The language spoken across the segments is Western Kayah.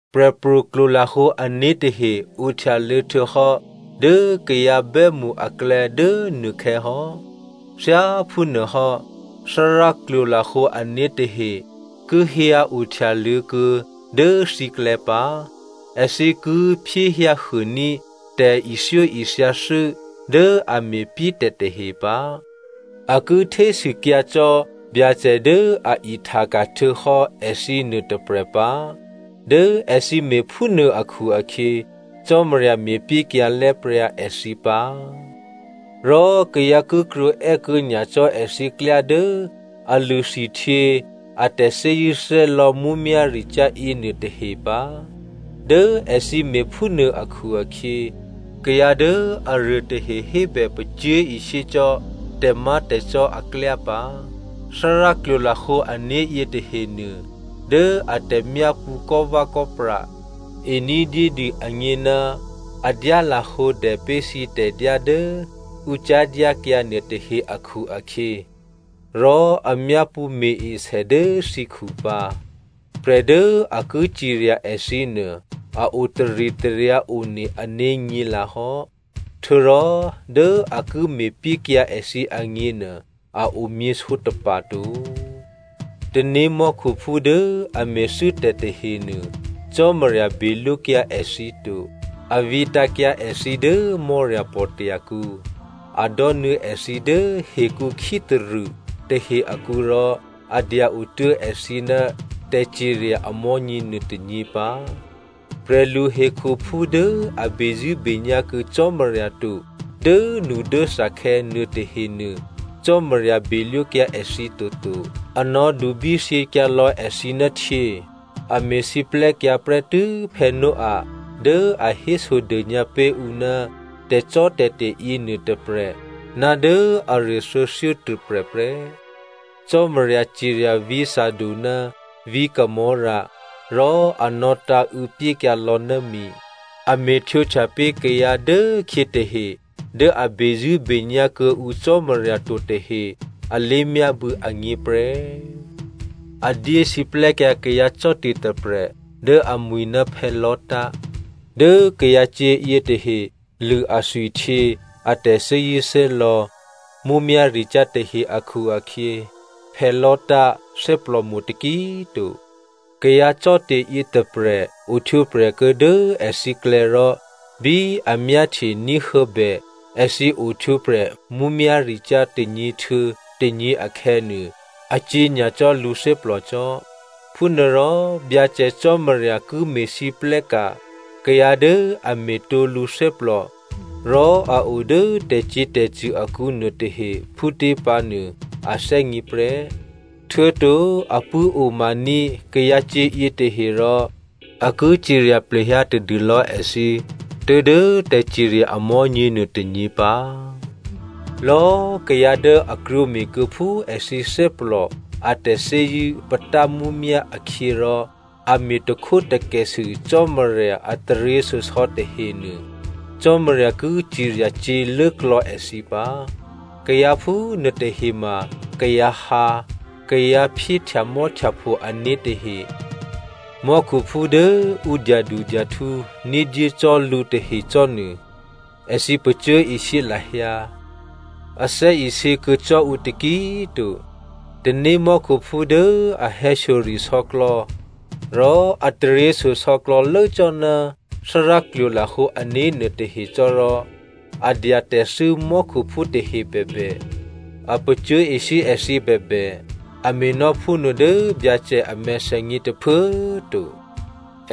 Prè̤pro̤ klwolahǒ ané̤ tahe ohtyaluô̌ htuô̌hò́ dố kayǎ bè́mṳ aklè̌ dố nuôkhè̌ hò́. Thyáphúnuôhò́, Thárá klwolahǒ ané̤ tahe ki hyǎ ohtyaluô̌ kuô̌ dố thǐklè̌ pǎ. Èthǐ ki phyéhyǎhuôní̤ tè̤ithyóithyathû́ dố a me̤pyétè̤ tahe pǎ. A ki htésûkyǎ cò́ Byacè dố a ihtaka̤ htuô̌hò́ èthǐ nuôtôprè̤ pǎ. Dố èthǐ me̤phúnuô akhu-akhyě, Cò́marya me̤pyékyǎ lè̤́pryǎ èthǐ pǎ. Rò kayǎ ki krwǒè́kuô̌ nyacò́ èthǐ klyá dố a lṳ̂ thwihtyě a tè̤thè́zṳ̂́thè́lò̌ mǔmyá̤ricyá̤ yěnuô tahe pǎ. Dố èthǐ me̤phúnuô akhu-akhyě, kayǎ dố aruô tahe hébè pacyé̤ishyé cò́ tè̤má̤tè̤cò́ aklyá pǎ. Thárá klwolahǒ ané̤ yětahenuô, dố a tè̤myápṳ̌ kò́vè̌kò́pra ení̤dyédû agně ná a dyá lahǒdè pé̤ thǐ tè̤dyá dố ǔ cyá̤dyákyǎ nuôtahe akhu-akhyě, rò a myápṳ̌ me̤-esè dố thǐkhu pǎ. Prè̤ dố a ki cirya èthǐ nuô a otaritaryǎ one ané̤ nyě̤lǎhò́, htuô̌rò dố a ki me̤pyékyǎ èthǐ agněnuô a omyě sǒtapa̤ to. Tanémò́khuphú dố a me̤thû́tè̤ tahenuô, Cò́marya belwókyǎ èthǐ to. A vǐtǎ̤kyǎ èthǐ dố Mò́rapò̤tya̤ kǔ. A dò́nuô̌ èthǐ dố hekǔ khítarṳ̂ tahe akǔ rò a dya-o tuố̤ èthǐ dố tè̤cirya amò̤́nyě nuôtônyě pǎ. Prè̤lu hekhuphú dố a bezṳ̂́benyá̤ kuô̌ Cò́marya to dốnudốthakhè̌ nuôtahenuô, Cò́marya belwókyǎ èthǐ toto, a nò̌dubí thyěkyǎ lò̌ èthǐ ná htyě. A me̤siplè́kyǎ prè́tû́ Noah dố a hésodônyǎ pé̤ ǔ ná tè̤cò́tè̤te̤ yěnuô tôprè̤ ná dố aruô thuô̌thyótôprè̤ prè́. Cò́marya cirya vǐ̤ Sodom ná vǐ̤ Gomorra, rò a nò̌tǎ̤û̌ pyékyǎ lò̌ ná mi. A me̤htwǒhtya pé̤ kayǎ dố khyě tahe dố a bezṳ̂́benyá̤ kuô̌ǔ Cò́marya to tahe alé̤myábû̌ agně prè́. A dyé siplè́kyǎ kayǎ cò́te̤ tôprè̤ dố amwi̤ ná Lot. Dố kayǎcyě̤ yětahe lṳ̂ athwihtyě a tè̤thè́zṳ̂́thè́lò̌ mǔmyá̤ricyá̤ tahe akhu-akhyě, Lot thè́plòmo̤ taki꤮ to. Kayǎ cò́te̤ yětôprè̤ ohtwǒprè̤ kuô̌ dố èthǐklè̌ rò bí a myáhtye ní̤huô̌bè èthǐ ohtwǒprè̤ mǔmyá̤ricyá̤ tônyě htuô̌ tônyě akhè̌nuô, acyě̤ nyacò́ lǔthè́plò cò́. Phúnuôrò Byacè Cò́marya ki me̤lwóhteka̤ kayǎ dố a me̤tǒ lǔthè́plò rò a o dố tè̤cyě̤tè̤cṳ̂ akǔ nuôtahe phútě pǎnuô a thè́gně prè́. Htuô̌to a pṳ̂́omaní̤ kayǎcyě̤ yětahe rò a ki cirya plehyǎ tadûlò̌ èthǐ tuố̤dố tè̤cirya amò̤́nyě nuôtônyě pǎ. Lò̌꤮ kayǎ dố a krwǒme̤kuô̌ phú èthǐ thè́plò a tè̤thè́zṳ̂́ patá mǔmyá̤ akhyě rò a me̤ takhwótakèsû Cò́marya a taryěshyosò̌ tahenuô, Cò́marya ki cirya cyě̤lốklò̌ èthǐ pǎ. Kayǎ phúnuôtahe ma kayǎ hǎ, kayǎ phyéhtyamò́htyapho ané̤ tahe. Mò́khuphú dố ǔ dyadudyahtǔ ní̤dyé cò́ lǔ tahecò́nuô, èthǐ pacyé̤ishyé lahyǎ, a thè́isě kuô̌ cò́ǔ taki꤮ to. Tanémò́khuphú dố a hè̌shyoresò̌klò̌ rò a taryěshyosò̌ klò̌lố cò́ ná Thárá klwolahǒ ané̤ nuôtahe cò́ rò, a dya tè̤thû́ mò́khuphú tahe bèbè, a pacyé̤ishyé èthǐ bèbè, a me̤nò́ phúnuô dố Byacè a mèthènyě tôphuố꤮ to.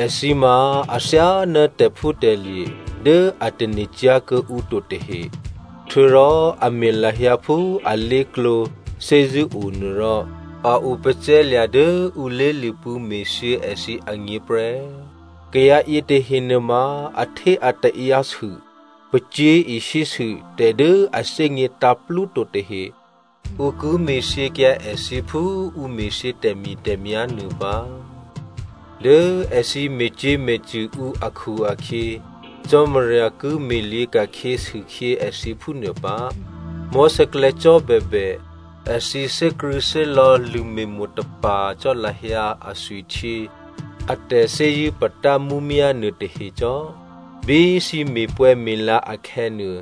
Èthǐ ma athyáná tè̤phútè̤lye̤ dố a tane̤cyá̤ kuô̌ǔ to tahe. Htuô̌rò a me̤ lahyǎ phú alé̤klǒ thè́zṳ̂́o nuô rò a opacè̤̌lya̤ dố ǔ lé̤lṳ̂pṳ̂́ me̤thyě èthǐ agně prè́. Kayǎ yětahe nuôma ahtéataǎyǎ sû, pacyé̤ishyé sû tè̤ dố a thè́gně tǎ̤plúto tahe. Ǔ ki me̤thyěkyǎ èthǐ phú ǔ me̤thyě tè̤mi̤tè̤myá̤ nuô pǎ. Dố èthǐ me̤cyě̤me̤cṳ̂ ǔ akhu-akhyě Cò́marya ki me̤lyě̤ ka̤khyě sûkhyě èthǐ phúnuô pǎ. Mò̤́sè̌klè̌ cò́ bèbè èthǐ thè́krṳ̂̌thè́lò̌ lṳ̂me̤mo̤ tapa̤ cò́ lahyǎ athwihtyě a tè̤thè́zṳ̂́ patámǔmyá̤ nuôtahe cò́. Bí thǐ me̤pwè̌me̤la akhè̌nuô,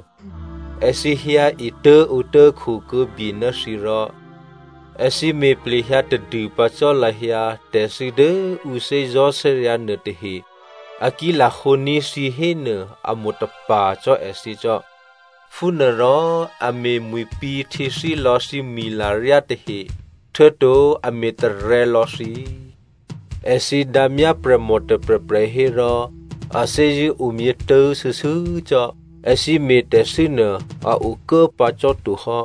èthǐ hyǎ etố̤ǒtố̤ khokuô̌bye ná thǐ rò, èthǐ me̤ plehyǎ tadû pǎ cò́ lahyǎ tè̤thû́ dố ǔ thè́zò̤́thè́ryǎ̤ nuôtahe, a ki lahǒní̤ thǐ hénuô amo̤tapa̤ cò́ èthǐ cò́. Phúnuôrò a me̤mwi̤pǐ̤ htyěthílò̌ thǐ mwi̤laryá tahe, htuô̌to a me̤tarè̤̌ lò̌ thǐ. Èthǐ dǎmyá prè̤mò tôprè̤prè̤ hérò a thè́zṳ̂́ omyětố̤ shuô̌shuô̌ cò́. Èthǐ me̤tè̤thû́ nuô a okuố pǎ cò́to hò́.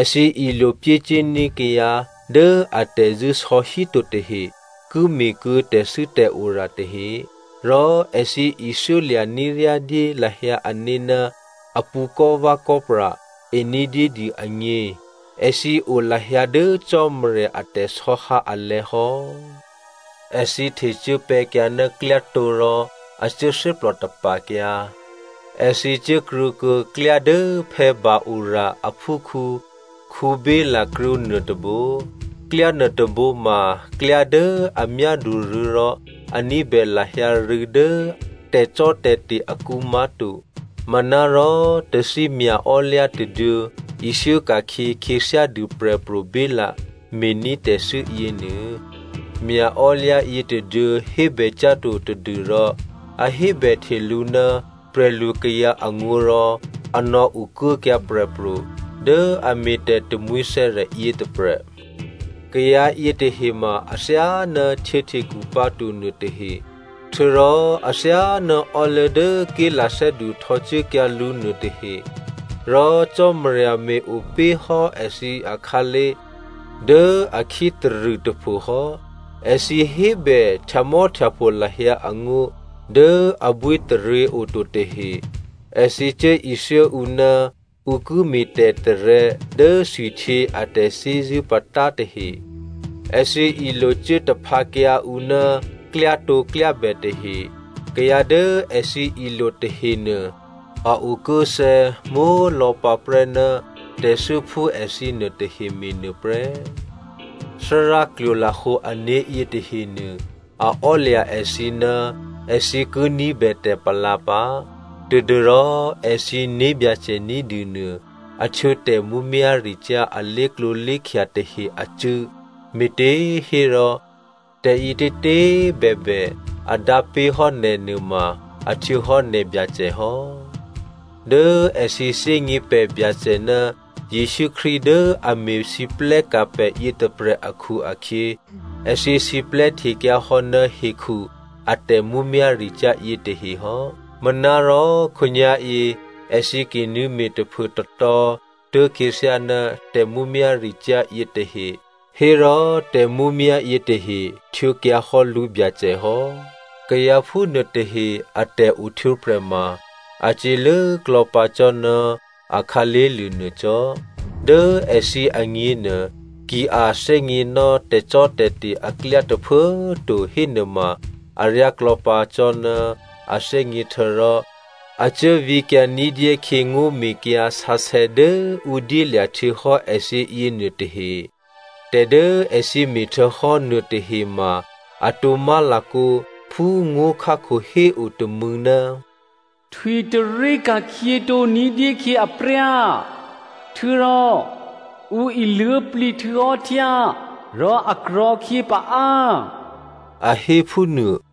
Èthǐ ilo pyécuốní̤ kayǎ dố atè̤zṳ̂́ sò̌ híto tahe ki me̤kuô̌ tè̤thû́tè̤ora tahe. Rò èthǐ ithyólya̤ ní̤ ryá dyé lahyǎ ané̤ ná apṳ̌ kò́vè̌kò́pra ení̤dyédû agně. Èthǐ o lahyǎ dố Cò́marya a tè̤sò̌hǎ alè̤̌ hò́. Èthǐ htecuốpè̤̌kyǎ ná klyátǒ rò a cuố thè́plò tapa̤kyǎ. Èthǐ cuốkrwǒkuô̌ klyá dố Beor aphúkhǔ Balaam krwǒ nuôtôbǒ. Klyá nuôtôbǒ ma klyá dố a myádu rû̌ rò a ní̤bè lahyǎ rû̌ dố tè̤cò́tè̤te̤ akǔ má̤to. Manárò tathí mya̤ò́lyǎ tôduô̌ ithyó ka̤khyě khyěthyádû prè̤pro̤ Baláam me̤ní̤ tè̤thû́ yěnuô. Mya̤ò́lyǎ yětôduô̌ hébè cyá̤to tadû́rò a hébèhte lǔ ná prè̤lukayǎ angó̤ rò a nò̌ okuốkyǎ prè̤pro̤ dố a me̤tè̤ tamwǐthè̌rè̤ yětôprè̤. Kayǎ yětahe ma athyáná htyěhtekhu pǎto nuôtahe. Htuô̌rò athyáná ò́luố̤ dố ké̤lathè́du htò̌cuốkyǎ lǔ nuôtahe. Rò Cò́marya me̤-opé̤ hò́ èthǐ akhǎlé̤ dố a khítarṳ̂ tôphohò́. Èthǐ hébè htyamò́htyapho lahyǎ angó̤ dố abwítaryě oto tahe. Èthǐ cuố ithyó ǔ ná ǔ ki me̤tè̤tarè̤̌ dố thwihtyě a tè̤thè́zṳ̂́ patá tahe. Èthǐ ilocuố taphǎkyǎ ǔ ná klyátǒklyábè tahe. Kayǎ dố èthǐ ilo tahenuô, a okuốthè̌ mólò̌pǎprè́ ná tè̤thû́ phú èthǐ nuôtahe me̤nuô prè́. Thárá klwolahǒ ané̤ yětahenuô, a ò́lya̤ èthǐ ná èthǐ ki ní̤bè tè̤palǎ pǎ, tadû́rò èthǐ né̤byacè ní̤dû nuô, a htwǒ tè̤mǔmyá̤ricyá̤ a lé̤klǒlé̤khya tahe acṳ̂́, me̤těhérò tè̤ǐtětě꤮ bèbè, a dǎ pé̤hò́ nè̤ nuôma, a htwǒhò́ nè̤byacè hò́. Dố èthǐ thè́gně pè̤ Byacè ná Jesǔ Krístu dố a me̤lwóhteka̤ pè̤ yětôprè̤ akhu-akhyě èthǐ siplè́htekyǎhò́ ná hekhu a tè̤mǔmyá̤ricyá̤ yětahe hò́. Manárò khǒnyá̤yě èthǐ ki nuô̌me̤ taphuôtatò̤̌ tố̤khyěthyá ná tè̤mǔmyá̤ricyá̤ yětahe hérò tè̤mǔmyá̤ yětahe htwǒkyǎhò́ lǔbyacè hò́. Kayǎ phúnuôtahe a tè̤ohtwǒprè̤ ma, a cyě̤lốklò̌ pǎ cò́ ná a khǎlé̤lye̤ nuô cò́. Dố èthǐ agněnuô, ki a thè́gněnò́ tè̤cò́tè̤te̤ aklyá tôphuố꤮ to hénuôma aryáklò̌ pǎ cò́ná a thè́gně htuô̌rò a cuố vǐkyǎ ní̤dyé khyě ngó̤mekyǎ sǎsè̌ dố ǔ dyélya̤ htuô̌hò́ èthǐ yěnuôtahe. Tè̤ dố èthǐ me̤htuô̌hò́ nuôtahe ma, atǒ má̤lakǒ phú ngó̤khákho héo tômû̌, “Htwi tarí ka̤khyětǒ ní̤dyé khyě apryá,” htuô̌rò “Ǔ iluố̤plǐ htuô̌hò́ htyá, rò a tarò̤̌khyě paá” a hé phúnuô.